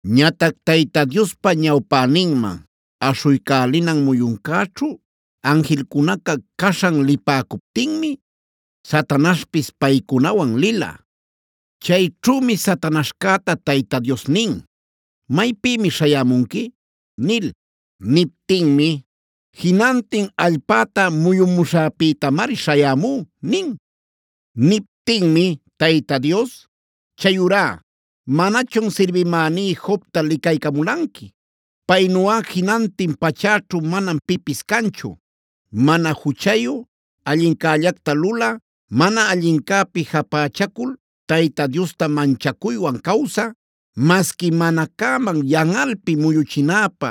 Ñatac Tayta Diospa ñawpäninman aśhuycälinan muyuncäćhu anjilcunaca caśhan lipäcuptinmi Satanaśhpis paycunawan lila. Chayćhümi Satanaśhcäta Tayta Dios nin: “¿Maypïmi śhayämunqui?” nil. Niptinmi: “Jinantin allpäta muyumuśhäpïtamari śhayämú” nin. Niptinmi Tayta Dios: “Chayurá, ¿manachun sirbimäní Jobta licaycamulanqui? Paynuꞌa jinantin pachäćhu manam pipis canchu: mana juchayu, allincällacta lulä, mana allincäpi japächacul Tayta Diosta manchacuywan cawsä. Masqui mana cäman yanꞌalpi muyuchinäpä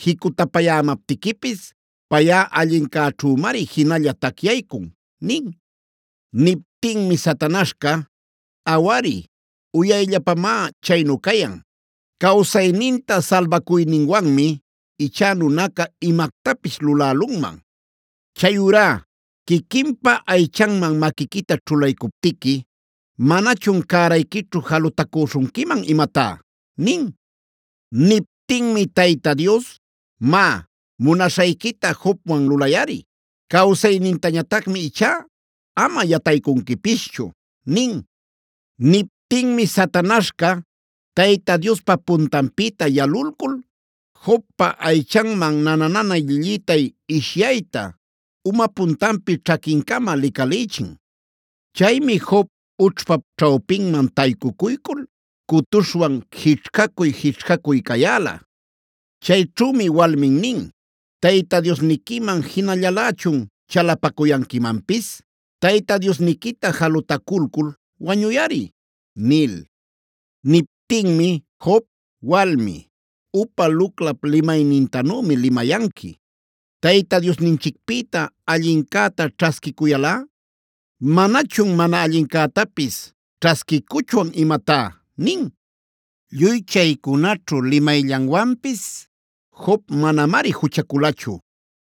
jicutapayämaptiquipis, payꞌa allincäćhümari jinalla tacyaycun” nin. Niptinmi Satanaśhca: “Awari, uyayllapamá chaynu cayan. Cawsayninta salbacuyninwanmi ichá nunaca imactapis lulälunman. Chayurá ¿quiquinpa aychanman maquiquita ćhulaycuptiqui manachun cärayquićhu jalutacüśhunquiman imatá?” nin. Niptinmi Tayta Dios: “Má, munaśhayquita Jobwan lulayꞌari. Cawsaynintañatacmi ichá ama yataycunquipischu” nin. Niptinmi Satanaśhca Tayta Diospa puntanpïta yalulcul Jobpa aychanman nana-nanay llillïtay ishyayta, uma puntanpi ćhaquincama licalïchin. Chaymi Job ućhpap ćhawpinman taycucuycul cutuśhwan jićhcacuy-jićhcacuy cayäla. Chayćhümi walmin nin: “¿Tayta Diosniquiman jinallalächun chalapacuyanquimanpis? Tayta Diosniquita jalutaculcul wañuyꞌari” nil. Niptinmi Job: “Walmi, upa luclap limaynintanümi limayanqui. Tayta Diosninchicpïta allincäta ćhasquiycuyalꞌa ¿¡manachun mana allincätapis ćhasquiycuchwan imatá!?” nin. Lluy chaycunaćhu limayllanwanpis Job manamari juchaculachu.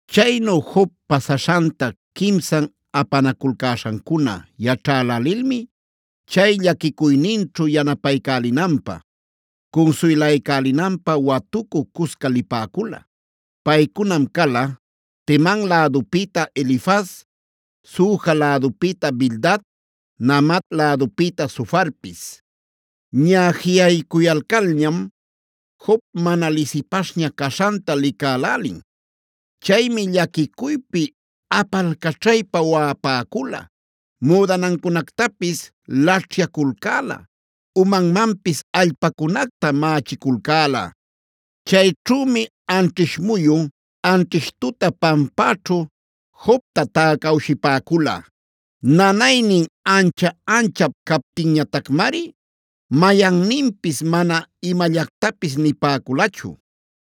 Chaynu Job pasaśhanta quimsan apanaculcäśhancuna yaćhälälilmi chay llaquicuyninćhu yanapaycälinanpä, cunsuylaycälinanpä watucü cusca lipäcula. Paycunam cala: Teman lädupïta Elifaz, Suja lädupïta Bildad, Naamat lädupïta Zofarpis. Ñaꞌa jiꞌaycuyalcalñam Job mana lisipaśhña caśhanta licälälin. Chaymi llaquicuypi apalcaćhaypa waꞌapäcula, müdanancunactapis laćhyaculcäla, umanmanpis allpacunacta mächiculcäla. Chayćhümi anćhish muyun, anćhish tuta pampäćhu Jobta täcawshipäcula. Nanaynin ancha-anchap captinñatacmari mayanninpis mana imallactapis nipäculachu.